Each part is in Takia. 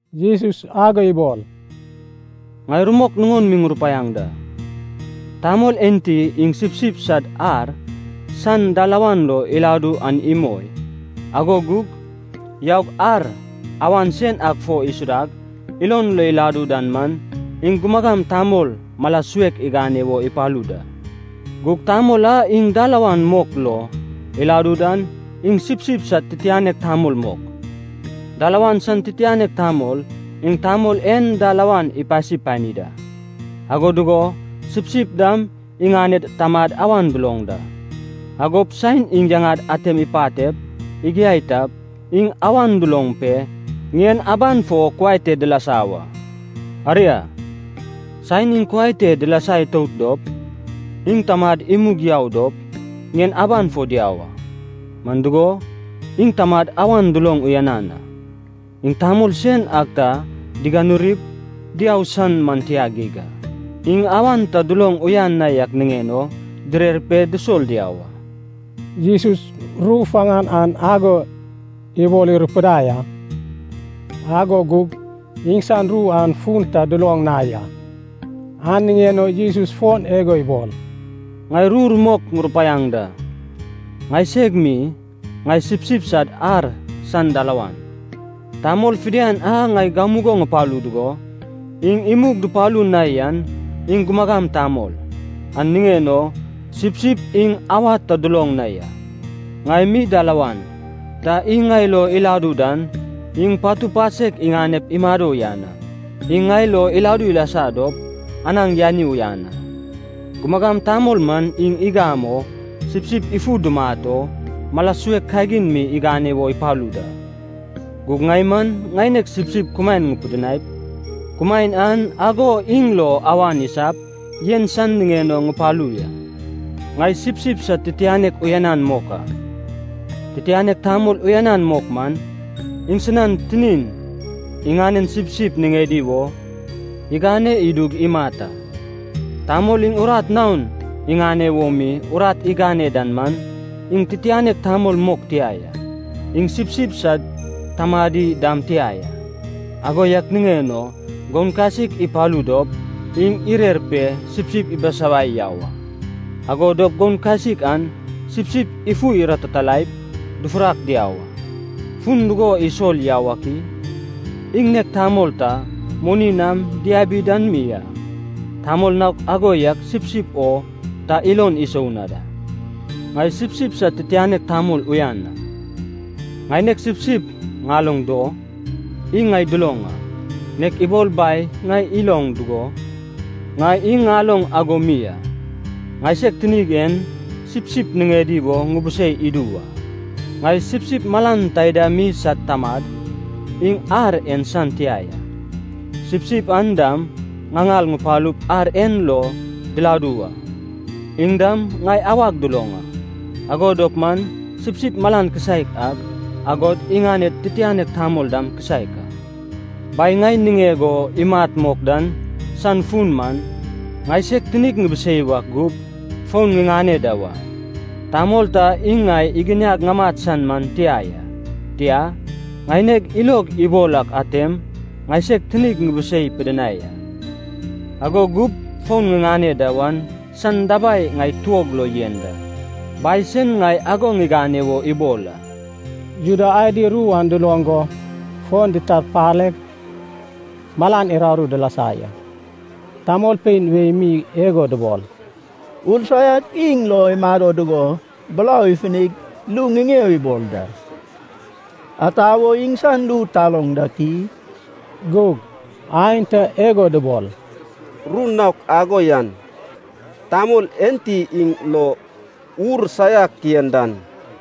Jesus ago ibol, “Ŋai rumok nuŋon mi ŋurupaiaŋ da. Tamol enti iŋ sipsip sad ar san dalawan lo iladu an imoi, ago gug yaug ar awan sen ak fo isudag, ilon lo iladu dan man, iŋ gumagam tamol mala suek igane wo ipalu da. Gug tamol a iŋ dalawan lo mok iladu dan, iŋ sipsip sad titianek tamol mok. Dalawan san titianek tamol iŋ tamol en dalawan ipasi pani da. Ago dugo sipsip dam iŋaned tamad awan duloŋ da. Agop saen iŋ yaŋad atem ipatep, igiai tap, iŋ awan duloŋ pe, ŋien aban fo kuai te dilasa wa. Aria, saen iŋ kuai te dilasa itout dop, iŋ tamad imug yau dop, ŋien aban fo diau a, man dugo, iŋ tamad awan duloŋ uyanan a. Iŋ tamol sen ak ta diganurip diau san man tia geig a. Iŋ awan ta duloŋ uyan na yak niŋen o direr pe dusol diau a.” Jesus ru faŋan an ago ibol irupudai a, ago gug iŋsan ru an fun ta duloŋ na ya. An niŋen o Jesus fon igo ibol, “Ŋai ru rumok ŋurupaiaŋ da. Ŋaiseg mi, ŋai sipsip sad ar san dalawan. Tamol fidian a ŋai gamugo ŋupalu dugo, iŋ imug dupalu na yan, iŋ gumagam tamol. An niŋen o sipsip iŋ awad ta duloŋ na ya. Ŋai mi dalawan. Ta iŋ ŋai lo iladu dan, iŋ patu pasek iŋanep imado uyan a. Iŋ ŋai lo iladu ilasa dop, anaŋ yani uyan a. Gumagam tamol man iŋ igam o, sipsip ifu dumat o, mala suek kagin mi igane wo ipalu da. Gug ŋai man ŋaineg sipsip kumaen ŋupidinaip, kumaen an ago iŋ lo awan isap, yen san niŋen o ŋupalu ya.” “Ŋai sipsip sad titianek uyanan mok a. Titianek tamol uyanan mok man, iŋsinan tinin iŋanen sipsip niŋedi wo igane idug imat a. Tamol iŋ urat naon iŋane wo mi, urat igane dan man, iŋ titianek tamol mok tia ya. Iŋ sipsip sad tamadi dam tia ya. Ago yak niŋen o goun kasik ipalu dop, iŋ irer pe sipsip ibisawai yau a. Ago dop goun kasik an sipsip ifu iratitalaip, dufurak diau a. Fun dugo isol yau ak i? Iŋ nek tamol ta moni nam diabi dan mi a, tamol naok ago yak sipsip o ta ilon isou na da. Ŋai sipsip sad titianek tamol uyan a. Ŋaineg sipsip ŋaloŋ do, iŋ ŋai duloŋ a, nek ibol Bai ŋai iloŋ dugo, ŋai iŋ ŋaloŋ ago mi a. Ŋaiseg tinig en sipsip niŋedi wo ŋubusei idu wa. Ŋai sipsip malan taida mi sad tamad, iŋ ar en san tia ya. Sipsip an dam ŋaŋal ŋupalup ar en lo diladu wa. Iŋ dam ŋai awag duloŋ a, ago dop man sipsip malan kisaek ak, agod iŋaned titianek tamol dam kisaek a. Bai ŋai niŋeg o imat mok dan san fun man, ŋaiseg tinig ŋibisei wak gup, fon ŋiŋane da wa. Tamol ta iŋ ŋai iginiag ŋamat san man tia ya. Tia, ŋaineg ilog ibol ak atem ŋaiseg tinig ŋibisei pidinai a, ago gup fon ŋiŋane da wan san dabai ŋai tuog lo yen da. Bai sen ŋai ago ŋigane wo ibol a.” Juda adi ru an duloŋ go fon ditarpaleg malan uraru dilasa ya. Tamolpein wei mi igo dubol, “Ur saiak iŋ lo imado dugo, burau ifunig ru ŋiŋeo ibol da. Ata wo iŋsan ru taloŋ dak i?” Gug aenta igo dubol, “Ru naok ago yan, tamol enti iŋ lo ur saiak yen dan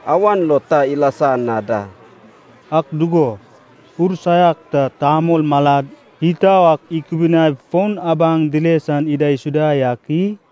awan lo ta ilasa na da. Ak dugo, ur saiak ta tamol malad itau ak ikubuniaip fon abaŋ dile san idaisuda yak i?”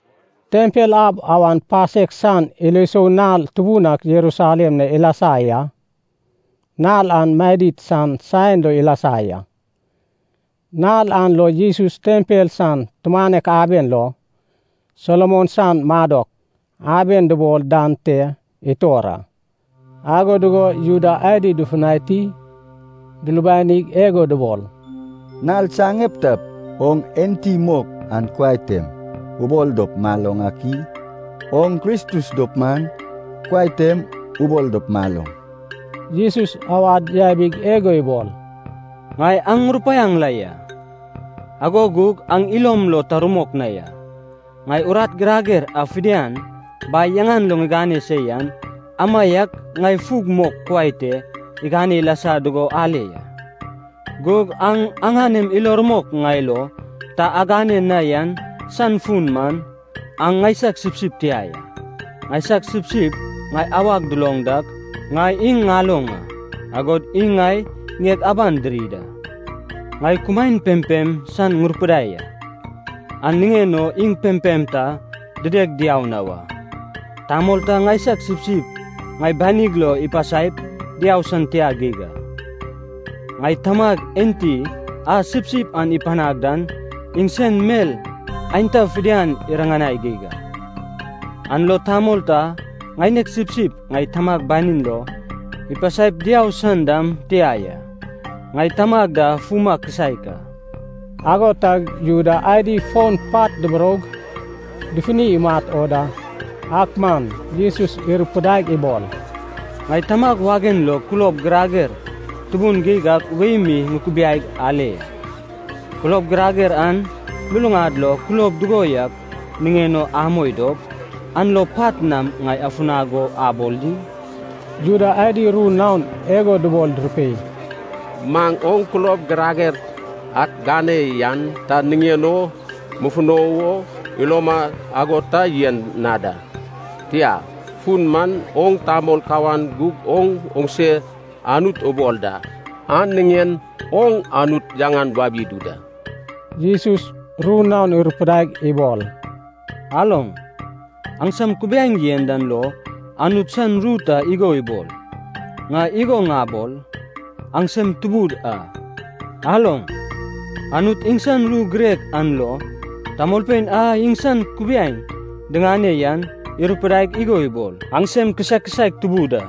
Tempel ab awan pasek san ilo isou nal tubun ak Jerusalem na ilasa ya. Nal an madid san saen lo ilasa ya. Nal an lo Jesus tempel san tumanek aben lo, Solomon san Madok Aben dubol dan te itor a. Ago dugo Juda adi dufutani dulubanig igo dubol, “Nal saŋeptap oŋ enti mok an kuai tem ubol dop maloŋ ak i? Oŋ Kristus dop man, kuai tem ubol dop maloŋ.” Jesus awad yabig igo ibol, “Ŋai aŋ ŋurupaiaŋ la ya, ago gug aŋ ilom lo ta rumok na ya. Ŋai urat girager a fidian Bai yaŋan lo ŋigane se yan, amaiak ŋai fug mok kuai te igane ilasa dugo ale ya. Gug aŋ aŋanem ilo rumok ŋai lo ta agane na yan san fun man, aŋ ŋaisag sipsip tia ya. Ŋaisag sipsip ŋai awag duloŋ dak, ŋai iŋ ŋaloŋ a, agod iŋ ŋai ŋieg aban diri da. Ŋai kumaen pempem san ŋupidinai a, an niŋen o iŋ pempem ta dideg diau na wa. Tamol ta ŋaisag sipsip ŋai banig lo ipasaip diau san tia geig a. Ŋai Tamag enti a sipsip an ipanag dan iŋsen mel aenta fidian iriŋanai geig a. An lo tamol ta ŋaineg sipsip ŋai Tamag banin lo ipasaip diau san dam tia ya. Ŋai Tamag da fuma kisaek a.” Ago tag Juda adi fon pat duburoug, dufuni imat o da. Ak man Jesus irupudaig ibol, “Ŋai Tamag wagen lo kulob girager tubun geig ak wei mi ŋukubiaig ale ya. Kulob girager an luluŋad lo kulob dugo yak niŋen o amoi dop, an lo pat nam ŋai afunag o abol di?” Juda adi ru naon igo dubol durupei, “Maŋ oŋ kulob girager ak gane yan ta niŋen o mufuno wo iloma ago ta yen na da. Tia, fun man oŋ tamol kawan gug oŋ oŋse Anut ubol da! An niŋen oŋ Anut yaŋan wabi idu da.” Jesus ru naon irupudaig ibol, “Aloŋ, aŋsam kubiaeŋ yen dan lo Anut san ru ta igo ibol, ‘Ŋai igo ŋabol, aŋsem tubud a.’ Aloŋ, Anut iŋsan ru girek an lo, tamolpein a iŋsan kubiaeŋ diŋane yan, irupudaig igo ibol, ‘aŋsem kisaek kisaek tubud a.’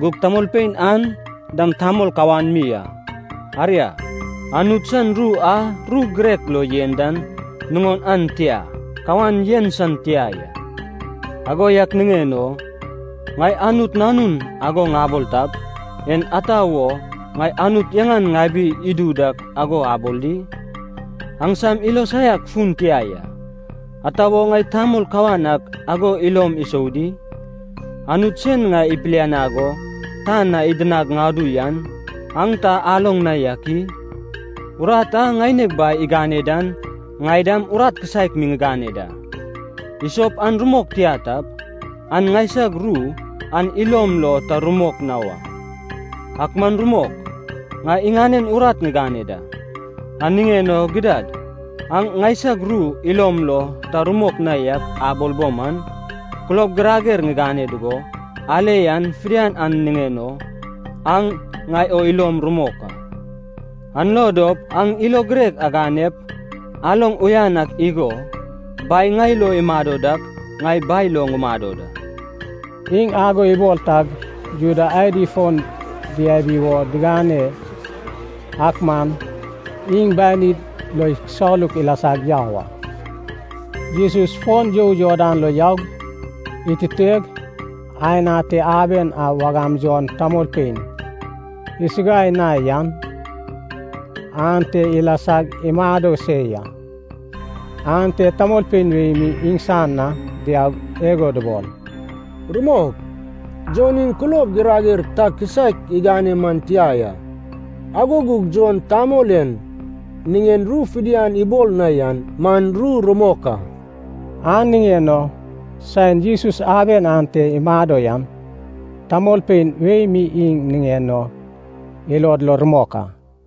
Gug tamolpein an dam tamol kawan mi a. Aria, Anut san ru a ru girek lo yen dan nuŋon an tia kawan yen san tia ya. Ago yak niŋen o, ‘Ŋai Anut Nanun’ ago ŋabol tap, en ata wo ŋai Anut yaŋan ŋabi idu dak ago abol di? Aŋsam ilo saiak fun tia ya. Ata wo ŋai tamol kawan ak ago ilom isou di? Anut sen ŋai ipilianag go tan na iginiag ŋadu yan aŋ ta aloŋ na yak i? Urat a ŋaineg Bai igane dan ŋai dam urat kisaek mi ŋigane da. Isop an rumok tia tap, aŋ ŋaisag ru an ilom lo ta rumok na wa. Ak man rumok, ŋai iŋanen urat ŋigane da. An niŋen o gidad, aŋ ŋaisag ru ilom lo ta rumok na yak abol bo man, kulob girager ŋigane dugo, ale yan fidian an niŋen o, aŋ ŋai o ilom rumok a. An lo dop aŋ ilo girek aganep, aloŋ uyan ak igo, Bai ŋai lo imado dak, ŋai Bai lo ŋumado da.” Iŋ ago ibol tag Juda adi fon diabi wo digane, ak man iŋ banid lo ikisaluk ilasag yau a. Jesus fon you Jordan lo yaug, ituteg, aen ate aben a wagam Jon tamolpein isuguai na yan ante ilasag imado se ya. Ante tamolpein wei mi iŋsan na diaug igo dubol, “Rumok, Jon iŋ kulob girager ta kisaek igane man tia ya. Ago gug Jon tamol en niŋen ru fidian ibol na yan man ru rumok a.” An niŋen o saen Jesus aben ante imado yan, tamolpein wei mi iŋ niŋen o ilod lo rumok a.